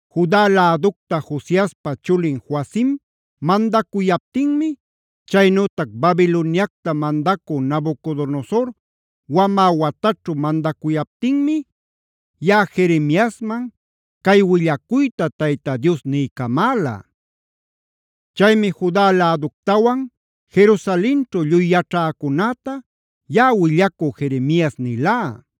Juda läducta Josiaspa chulin Joacima mandacuyaptinmi, chaynütac Babiloniacta mandacü Nabucodonosor wamä wataćhu mandacuyaptinmi yaꞌa Jeremiasman cay willacuyta Tayta Dios niycamäla. Chaymi Juda läductawan Jerusalenćhu lluy yaćhäcunäta yaꞌa willacü Jeremias nilá: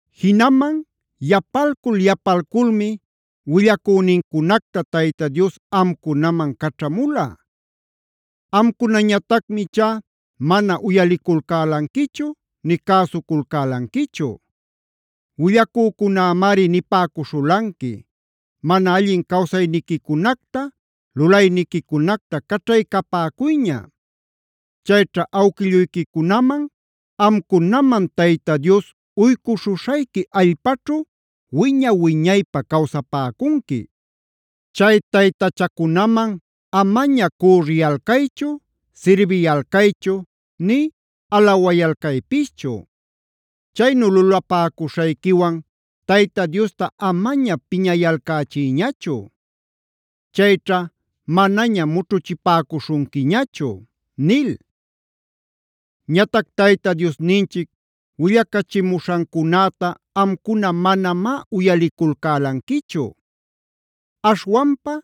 “Jinaman yapalcul-yapalculmi willacünincunacta Tayta Dios amcunaman caćhamula. Amcunañatacmi ichá mana uyaliculcälanquichu nï cäsuculcälanquichu. Willacücunämari nipäcuśhulanqui: ‘Mana allin cawsayniquicunacta, lulayniquicunacta caćhaycapäcuyña. Chayćha awquilluyquicunaman, amcunaman Tayta Dios uycuśhuśhayqui allpaćhu wiña-wiñaypä cawsapäcunqui. Chay taytachacunaman amaña cürriyalcaychu, sirbiyalcaychu nï alawayalcaypischu. Chaynu lulapäcuśhayquiwan Tayta Diosta amaña piñayalcächiyñachu. Chayćha manaña mućhuchipäcuśhunquiñachu’ nil. “Ñatac Tayta Diosninchic willacachimuśhancunäta amcuna manamá uyaliculcälanquichu. Aśhwanpa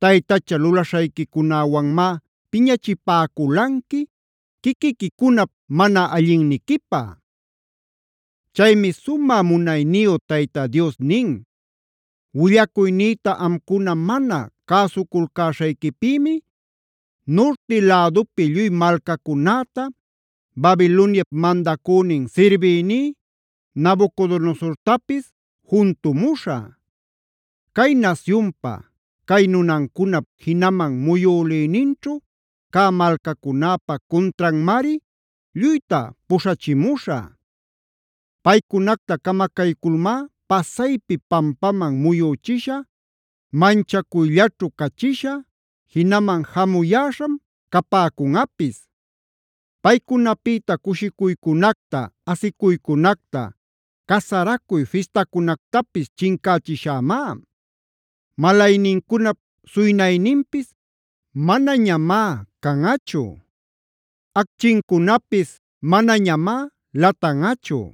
taytacha lulaśhayquicunäwanmá piñachipäculanqui quiquiquicunap mana allinniquipä. “Chaymi sumä munayniyu Tayta Dios nin: ‘Willacuynïta amcuna mana cäsuculcäśhayquipïmi, nurti lädupi lluy malcacunäta, Babiloniap mandacünin sirbïní Nabucodonosortapis juntumuśhä. Cay nasyunpa, cay nunancunap jinaman muyülïninćhu cä malcacunäpa cuntranmari lluyta puśhachimuśhä. Paycunacta camacayculmá pasaypi pampaman muyüchishä, manchacuyllaćhu cachishä; jinaman jamuyäśham capäcunꞌapis. Paycunapïta cushicuycunacta, asicuycunacta, casaracuy fistacunactapis chincächishämá.b Malaynincunap suynayninpis manañamá canꞌachu; acchincunapis manañamá latanꞌachu.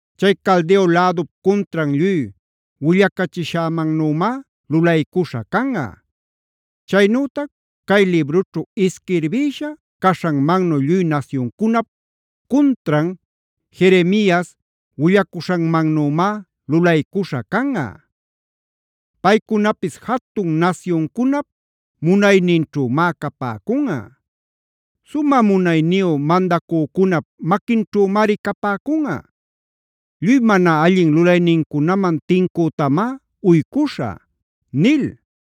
Chay Caldeo lädup cuntran lluy willacachishämannümá lulaycuśha canꞌa. Chaynütac cay librućhu isquirbïsha caśhanmannu lluy nasyuncunap cuntran Jeremias willacuśhanmannümá lulaycuśha canꞌa. Paycunapis jatun nasyuncunap munayninćhümá capäcunꞌa; sumä munayniyu mandacücunap maquinćhümari capäcunꞌa. Lluy mana allin lulaynincunaman tincütamá uycuśhä’” nil.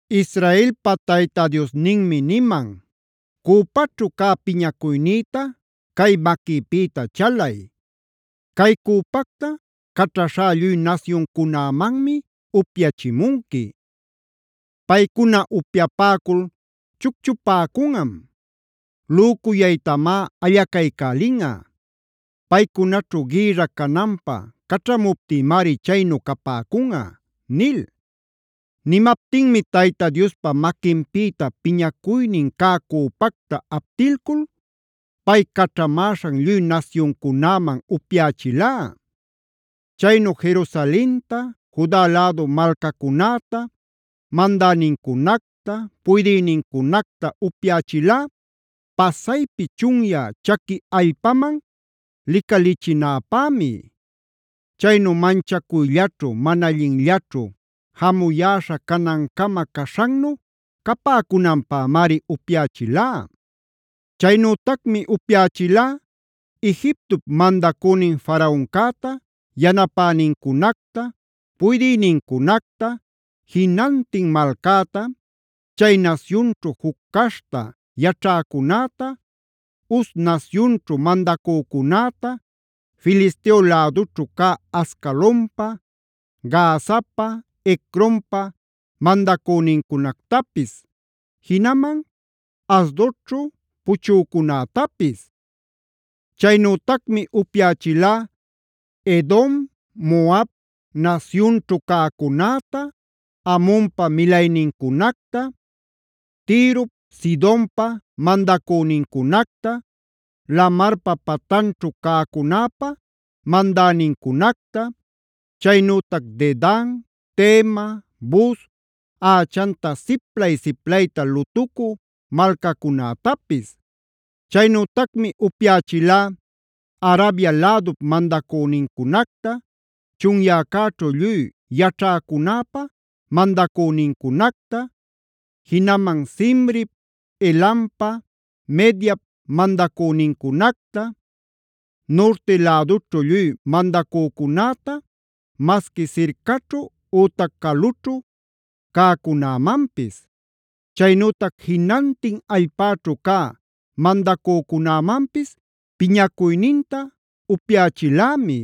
Israelpa Tayta Diosninmi niman: “Cüpaćhu cä piñacuynïta cay maquïpïta chalay.d Cay cüpacta caćhaśhá lluy nasyuncunämanmi upyachimunqui. Paycuna upyapäcul chucchupäcunꞌam; lücuyaytamá allacaycälinꞌa; paycunaćhu gïrra cananpä caćhamuptïmari chaynu capäcunꞌa” nil. Nimaptinmi Tayta Diospa maquinpïta piñacuynin cä cüpacta aptilcul pay caćhamäśhan lluy nasyuncunäman upyächilá. Chaynu Jerusalenta, Juda lädu malcacunäta, mandänincunacta, puydïnincunacta upyächilá pasaypi chunyä chaqui allpaman licalïchinäpämi. Chaynu manchacuyllaćhu, mana allinllaćhu, jamuyäśha canancama caśhannu capäcunanpämari upyächilá. Chaynütacmi upyächilá: Egiptop mandacünin Faraoncäta, yanapänincunacta, puydïnincunacta, jinantin malcäta, chay nasyunćhu juc caśhta yaćhäcunäta, Uz nasyunćhu mandacücunäta, Filisteo lädućhu cä Ascalonpa, Gazapa, Ecronpa mandacünincunactapis, jinaman Asdodćhu puchücunätapis. Chaynütacmi upyächilá: Edom, Moab nasyunćhu cäcunäta, Amonpa milaynincunacta, Tirop, Sidonpa mandacünincunacta, lamarpa patanćhu cäcunäpa mandänincunacta, chaynütac Dedan, Tema, Buz, ächanta siplay-siplayta lutucü malcacunätapis. Chaynütacmi upyächilá: Arabia lädup mandacünincunacta, chunyäcäćhu lluy yaćhäcunäpa mandacünincunacta, jinaman Zimrip, Elampa, Mediap mandacünincunacta, nurti lädućhu lluy mandacücunäta masqui sircaćhu ütac calućhu cäcunäman; chaynütac jinantin allpäćhu cä mandacücunämanpis piñacuyninta upyächilämi.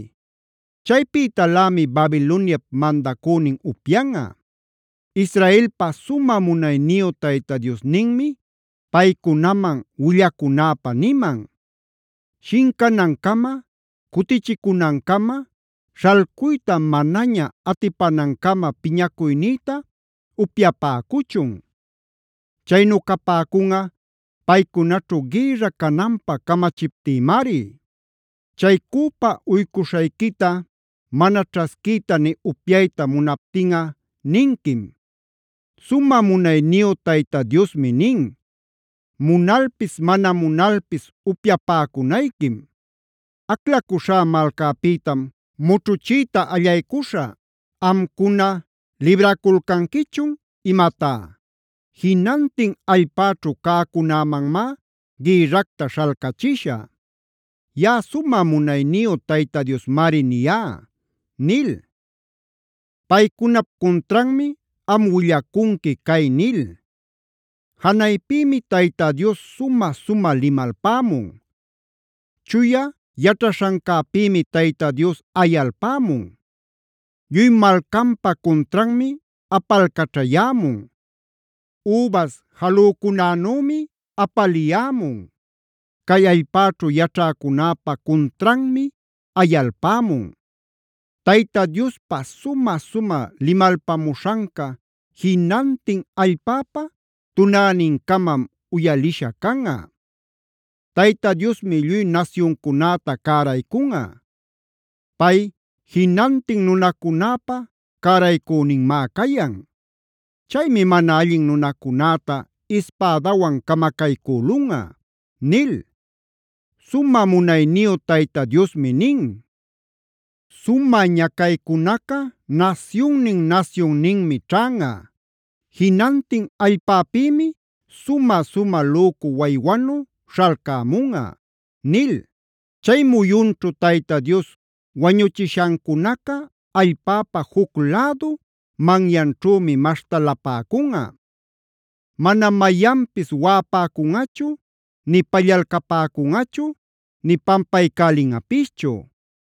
Chaypïtalämi Babiloniap mandacünin upyanꞌa. Israelpa sumä munayniyu Tayta Diosninmi paycunaman willacunäpä niman: “Shincanancama, cutichicunancama, śhalcuyta manaña atipänancama piñacuynïta upyapäcuchun. Chaynu capäcunꞌa paycunaćhu gïrra cananpä camachiptïmari. Chay cüpa uycuśhayquita mana ćhasquiyta nï upyayta munaptinꞌa ninquim: ‘Sumä munayniyu Tayta Diosmi nin: Munalpis mana munalpis upyapäcunayquim. Aclacuśhá malcäpïtam mućhuchiyta allaycuśhä. ¿Amcuna libraculcanquichun imatá? Jinantin allpäćhu cäcunämanmá gïrracta śhalcachishä. Yaꞌa sumä munayniyu Tayta Diosmari niyá’ nil. “Paycunap cuntranmi am willacunqui cay nil: “ ‘Janaypïmi Tayta Dios sumä-sumä limalpämun.e Chuya yaćhaśhancäpïmi Tayta Dios ayalpämun. Lluy malcanpa cuntranmi apalcaćhayämun; übas jalücunänümi apaliyämun; cay allpäćhu yaćhäcunäpa cuntranmi ayalpämun. Tayta Diospa sumä-sumä limalpamuśhanca jinantin allpäpa tunänincamam uyalisha canꞌa. Tayta Diosmi lluy nasyuncunäta cäraycunꞌa. Pay jinantin nunacunäpä cäraycüninmá cayan. Chaymi mana allin nunacunäta ispädawan camacaycülunꞌa’ nil. “Sumä munayniyu Tayta Diosmi nin: ‘Sumä ñacaycunaca nasyunnin-nasyunninmi ćhanꞌa. Jinantin allpäpïmi sumä-sumä lücu waywanu śhalcämunꞌa’” nil. Chay muyunćhu Tayta Dios wañuchishancunaca allpäpa juc lädu manyanćhümi maśhtalapäcunꞌa. Manam mayanpis waꞌapäcunꞌachu nï pallalcapäcunꞌachu nï pampaycälinꞌapischu.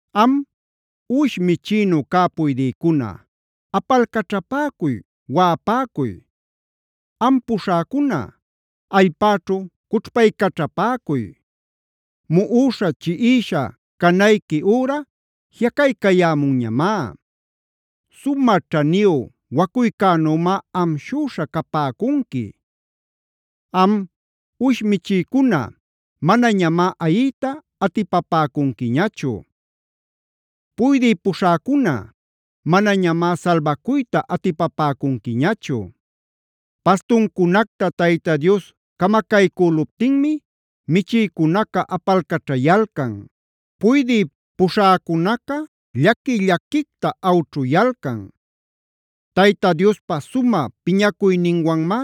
Am, uwish michïnu cä puydïcuna, apalcaćhapäcuy, waꞌapäcuy. Am puśhäcuna allpäćhu cućhpaycaćhapäcuy. Muꞌuśha, chiꞌisha canayqui üra jiꞌacaycayämunñamá. Sumä ćhaniyu wacuycänümá amshüśha capäcunqui. Am, uwish michïcuna manañamá ayiyta atipapäcunquiñachu; puydï puśhäcuna manañamá salbacuyta atipapäcunquiñachu. Pastuncunacta Tayta Dios camacaycüluptinmi michïcunaca apalcaćhayalcan; puydï puśhäcunaca llaqui-llaquicta awćhuyalcan. Tayta Diospa sumä piñacuyninwanmá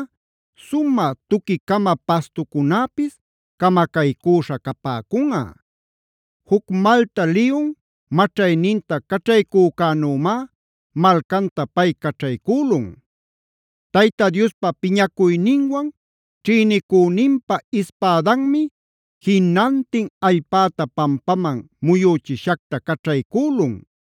sumä tuqui-cama pastucunäpis camacaycüśha capäcunꞌa. Juc malta liyun maćhayninta caćhaycücänümá malcanta pay caćhaycülun. Tayta Diospa piñacuyninwan ćhïnicüninpa ispädanmi jinantin allpäta pampaman muyüchishacta caćhaycülun.